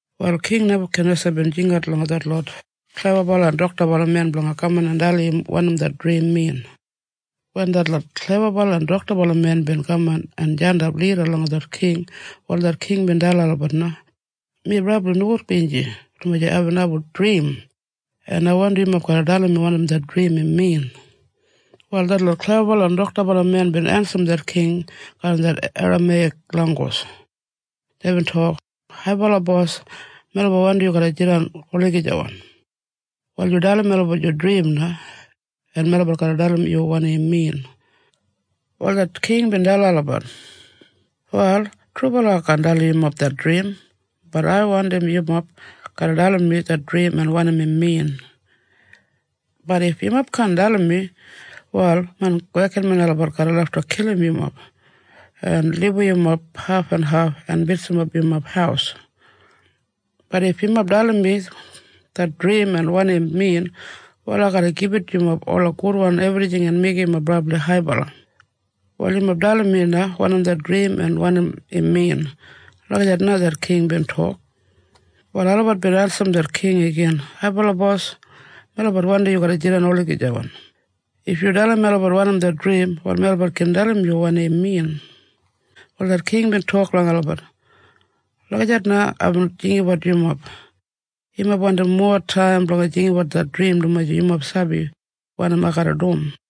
Wal King Nebakanesa bin jingat langa detlot klebabala en doktabala men blanga kaman en dalim im wanim det drim min. Wen detlot klebabala en doktabala men bin kaman en jandap lida langa det king, wal det king bin dalim olabat na, “Mi brabli nogudbinji dumaji aibin abum drim, en ai wandim yumob garra dalim mi wanim det drim im min.” Wal detlot klebabala en doktabala men bin ensim det king garram det Erameiyak langgus. Deibin tok, “Haibala bos, melabat wandim yu garra jidan olagijawan. Wal yu dalim melabat yu drim na, en melabat garra dalim yu wanim im min.” Wal det king bin dalim olabat, “Wal trubala ai kaan dalim yumob det drim bat ai wandim yumob garra dalim mi det drim en wanim im min. Bat if yumob kaan dalim mi, wal main wekinmen olabat garra lafta kilim yumob, en libum yumob hafenhaf, en bitsimap yumob haus. Bat if yumob dalim mi det drim en wanim im min wal ai garra gibit yumob ola gudwan ebrijing en meigim yumob brabli haibala. Wal yumob dalim mi na wanim det drim en wanim im min.” Lagijat na det king bin tok. Wal olabat bin ensim det king igin, “Haibala bos, melabat wandim yu garra jidan olagijawan. If yu dalim melabat wanim det drim, wal melabat gin dalim yu wanim im min.” Wal det king bin tok langa olabat, “Lagijat na aibin jinggabat yumob. Yumob wandim mowa taim blanga jinggabat det drim dumaji yumob sabi wanim ai garra dum.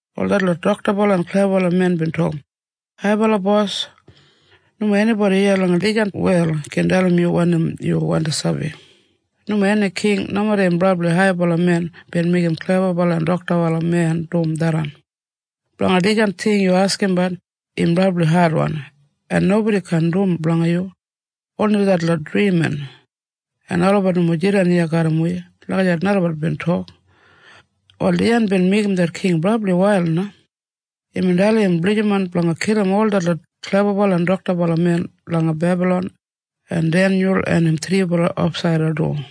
Wal detlot doktabala en klebabala men bin tok, “Haibala bos nomo enibodi iya langa dijan wel gin dalim yu wanim yu wandi sabi. Nomo eni king, nomeda im brabli haibala men bin meigim klebabala en doktabala men dum tharran. Blanga dijan ting yubin askimbat, im brabli adwan, en nobodi kaan dum blanga yu, oni detlot drimin, en olabat nomo jidan iya garram wi.” Lagijat na olabat bin tok. Wal dijan bin meigim det king brabli wail na. Imbin dalim im blijiman blanga kilim ol detlot klebabala en doktabala men langa Bebalon en Denyul en im thribala ofsaida du.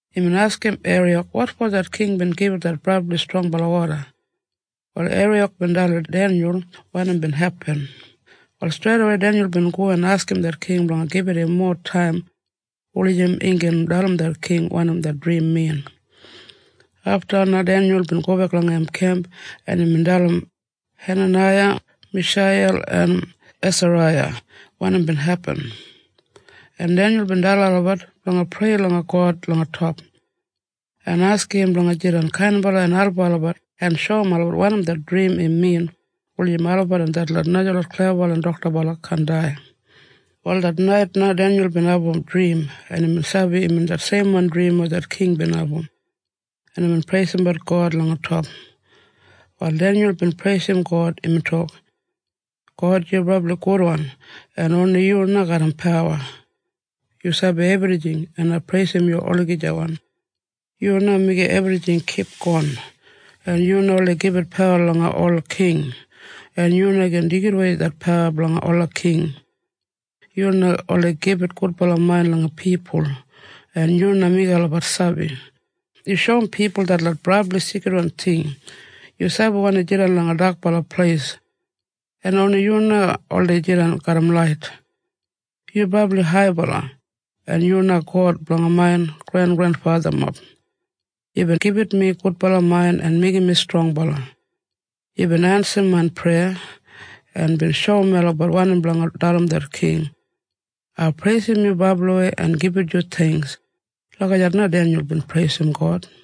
Imbin askim Eriyak wotfo det king bin gibit det brabli strongbala oda. Wal Eriyak bin dalim Denyul wanim bin hepin. Wal streidawei Denyul bin go en askim det king blanga gibit im mowa taim wulijim im gin dalim det king wanim det drim min. Afta na Denyul bin gobek langa im kemp en imbin dalim Henanaiya, Misheiyel en Esaraiya wanim bin hepin. En Denyul bin dalim olabat blanga prei langa God langa top, en askim im blanga jidan kainbala en album olabat en shoum olabat wanim det drim im min wulijim olabat en detlot najalot klebabala en doktabala kaan dai. Wal det nait na Denyul bin abum drim en imbin sabi imbin det seimwan drim weya det king bin abum, en imbin preisimbat God langa top. Wal Denyul bin preisim God. Imbin tok, “God, yu brabli gudwan en oni yu na garram pawa. Yu sabi ebrijing, en ai preisim yu olagijawan. Yu na meigim ebrijing kipgon, en yu na oldei gibit pawa langa ola king, en yu na gin deigidawei det pawa blanga ola king. Yu na oldei gibit gudbala main langa pipul, en yu na meigim olabat sabi. Yu shoum pipul detlot brabli sigridwan ting. Yu sabi wanim jidan langa dakbala pleis, en oni yu na oldei jidan garram lait. Yu brabli haibala, en yu na God blanga main grengrenfathamob. Yubin gibit mi gudbala main en meigim mi strongbala. Yubin ensim main preya, en bin shoum melabat wanim blanga dalim det king. Ai preisim yu brabliwei en gibit yu theingks.” Lagijat na Denyul bin preisim God.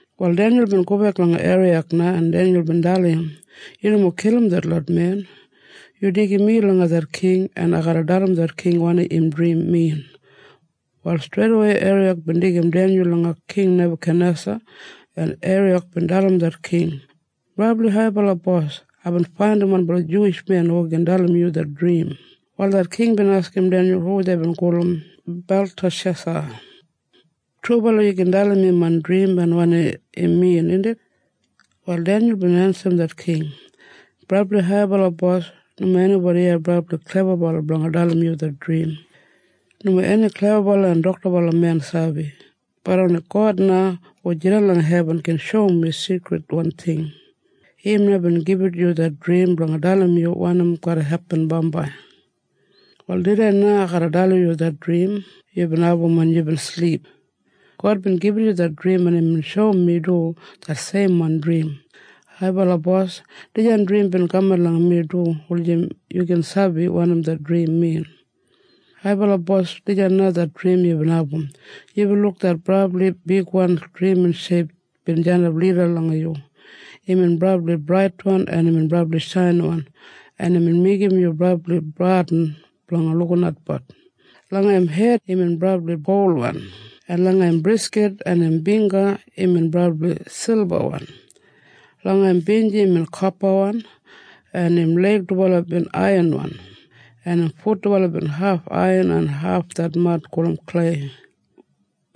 Wal Denyul bin gobek langa Eriyak na, en Denyul bin dalim im, “Yu nomo kilim detlot men. Yu deigim mi langa det king en ai garra dalim det king wanim im drim min.” Wal streidawei Eriyak bin deigim Denyul langa King Nebakanesa en Eriyak bin dalim det king, “Brabli haibala bos, aibin faindim wanbala Juwish men hu gin dalim yu det drim.” Wal det king bin askim Denyul hu deibin gulum Beltashesa, “Trubala yu gin dalim mi main drim en wanim im min, indit?” Wal Denyul bin ensim det king, “Brabli haibala bos, nomo enibodi iya brabli klebabalawan blanga dalim yu det drim. Nomo eni klebabala en doktabalawan men sabi. Bat oni God na hu jidan langa hebin gin shoum wi sigridwan ting. Im na bin gibit yu det drim blanga dalim yu wanim garra hepin bambai. Wal tudei na ai garra dalim yu det drim yubin abum wen yubin silip. God bin gibit yu det drim en imbin shoum mi du det seimwan drim. Haibala bos, dijan drim bin kaman langa mi du wulijim yu gin sabi wanim det drim min. “Haibala bos, dijan na det drim yubin abum. Yubin luk det brabli bigwan drimin sheip bin jandap lida langa yu. Imbin brabli braitwan en imbin brabli shainiwan en imbin meigim yu brabli bradin blanga lukinatbat. Langa im hed imbin brabli golwan, en langa im briskit en im bingga imbin brabli silbawan. Langa im binji imbin kopawan, en im leig dubala bin aiyanwan, en im fut dubala bin haf aiyan en haf det mad gulum klei.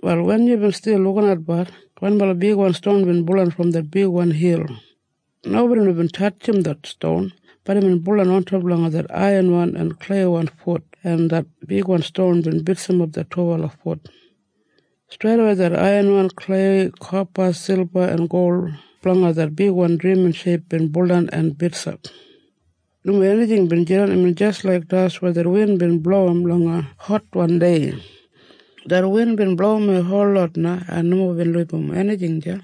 “Wal wen yubin stil lukinatbat, wanbala bigwan ston bin buldan brom det bigwan hil. Nobodi nomo bin tatjim det ston, bat imbin buldan ontop langa det aiyanwan en kleiwan fut en det bigwan ston bin bitsimap det dubala fut. Streidawei det aiyanwan, klei, kopa, silba en gol blanga det bigwan drimin sheip bin buldan en bitsap. Nomo enijing bin jidan, imbin jis laik das weya det win bin blowim langa hotwan dei. Det win bin blowimwei holot na en nomo bin libum enijing deya.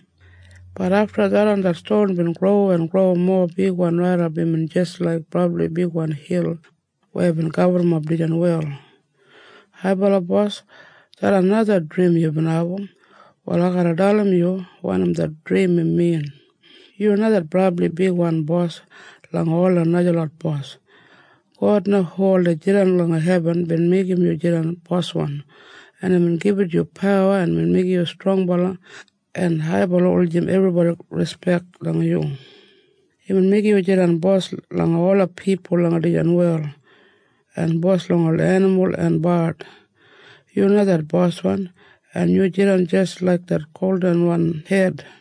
Bat afta tharran det ston bin gro en gro mowa bigwan raidap imbin jis laik brabli bigwan hil weya bin gaburrumap dijan wel. “Haibala bos, tharran na det drim yubin abum. Wal ai garra dalim yu wanim det drim im min. Yu na brabli bigwan bos langa ola najalot bos. God na hu oldei jidan langa hebin bin meigim yu jidan boswan, en imbin gibit yu pawa en meigim yu strongbala en haibala wulijim ebribodi rispek langa yu. Imbin meigim yu jidan bos langa ola pipul langa dijan wel, en bos langa ola enimul en bard. Yu na det boswan, en yu jidan jis laik det goldinwan hed.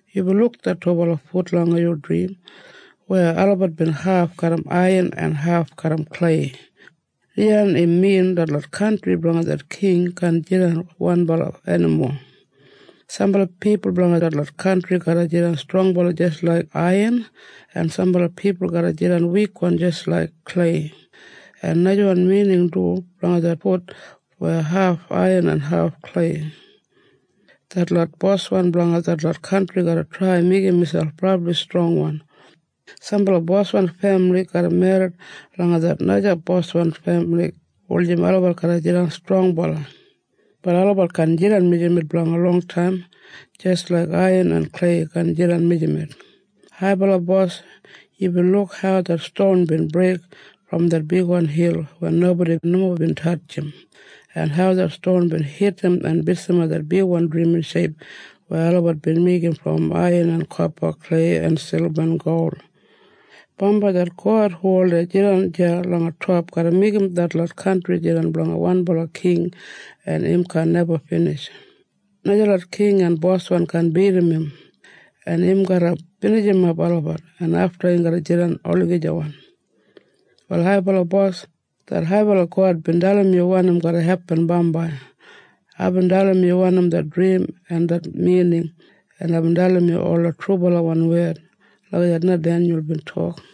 Yubin luk det dubala fut langa yu drim, weya olabat bin haf garram aiyan en haf garram klei. Dijan im min detlot kantri blanga det king kaan jidan wanbala enimo. Sambala pipul blanga detlot kantri garra jidan strongbala jis laik aiyan, en sambala pipul garra jidan wikwan jis laik klei. En najawan mining du blanga det fut weya haf aiyan en haf klei. Detlot boswan blanga detlot kantri garra trai meigim miselp brabli strongwan. Sambala boswan femili garra merrit langa det naja boswan femili wulijim olabat garra jidan strongbala. Bat olabat kaan jidan mijamet blanga longtaim, jis laik aiyan en klei kaan jidan mijamet. “Haibala bos, yubin luk hau det ston bin breik brom det bigwan hil wen nobodi nomo bin tatjim, en hau det ston bin hitim en bitsimap det bigwan drimin sheip weya olabat bin meigim brom aiyan en kopa, klei en silba en gol. Bambai det God hu oldei jidan deya langa top garra meigim detlot kantri jidan blanga wanbala king en im kaan neba binij. Najalot king en boswan kaan bidim im, en im garra binijimap olabat, en afta im garra jidan olagijawan. “Wal haibala bos, det haibala God bin dalim yu wanim garra hepin bambai. Aibin dalim yu wanim det drim en det mining, en aibin dalim yu ola trubalawan wed.” Lagijat na Denyul bin tok.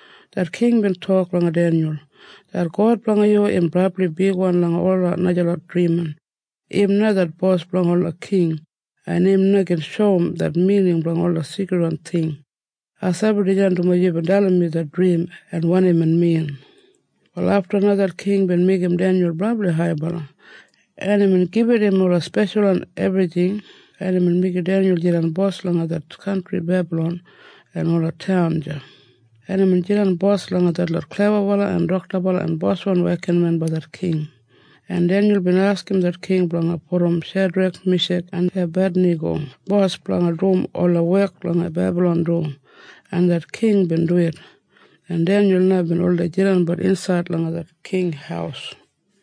Det king bin tok langa Denyul, “Det God blanga yu im brabli bigwan langa ola najalot drimin. Im na det bos blanga ola king, en im na gin shoum det mining blanga ola sigridwan ting. Ai sabi dijan dumaji yubin dalim mi det drim en wanim im min.” Wal afta na det king bin meigim Denyul brabli haibala, en imbin gibit im ola speshalwan ebrijing en imbin meigim Denyul jidan bos langa det kantri Bebalon en ola taun deya. En imbin jidan bos langa detlot klebabala en doktabala en boswan wekinmen blanga det king. En Denyul bin askim det king blanga pudum Shedrek, Mishak en Ebadinago bos blanga dum ola wek langa Bebalon du, en det king bin duwit. En Denyul na bin oldei jidanbat insaid langa det king haus.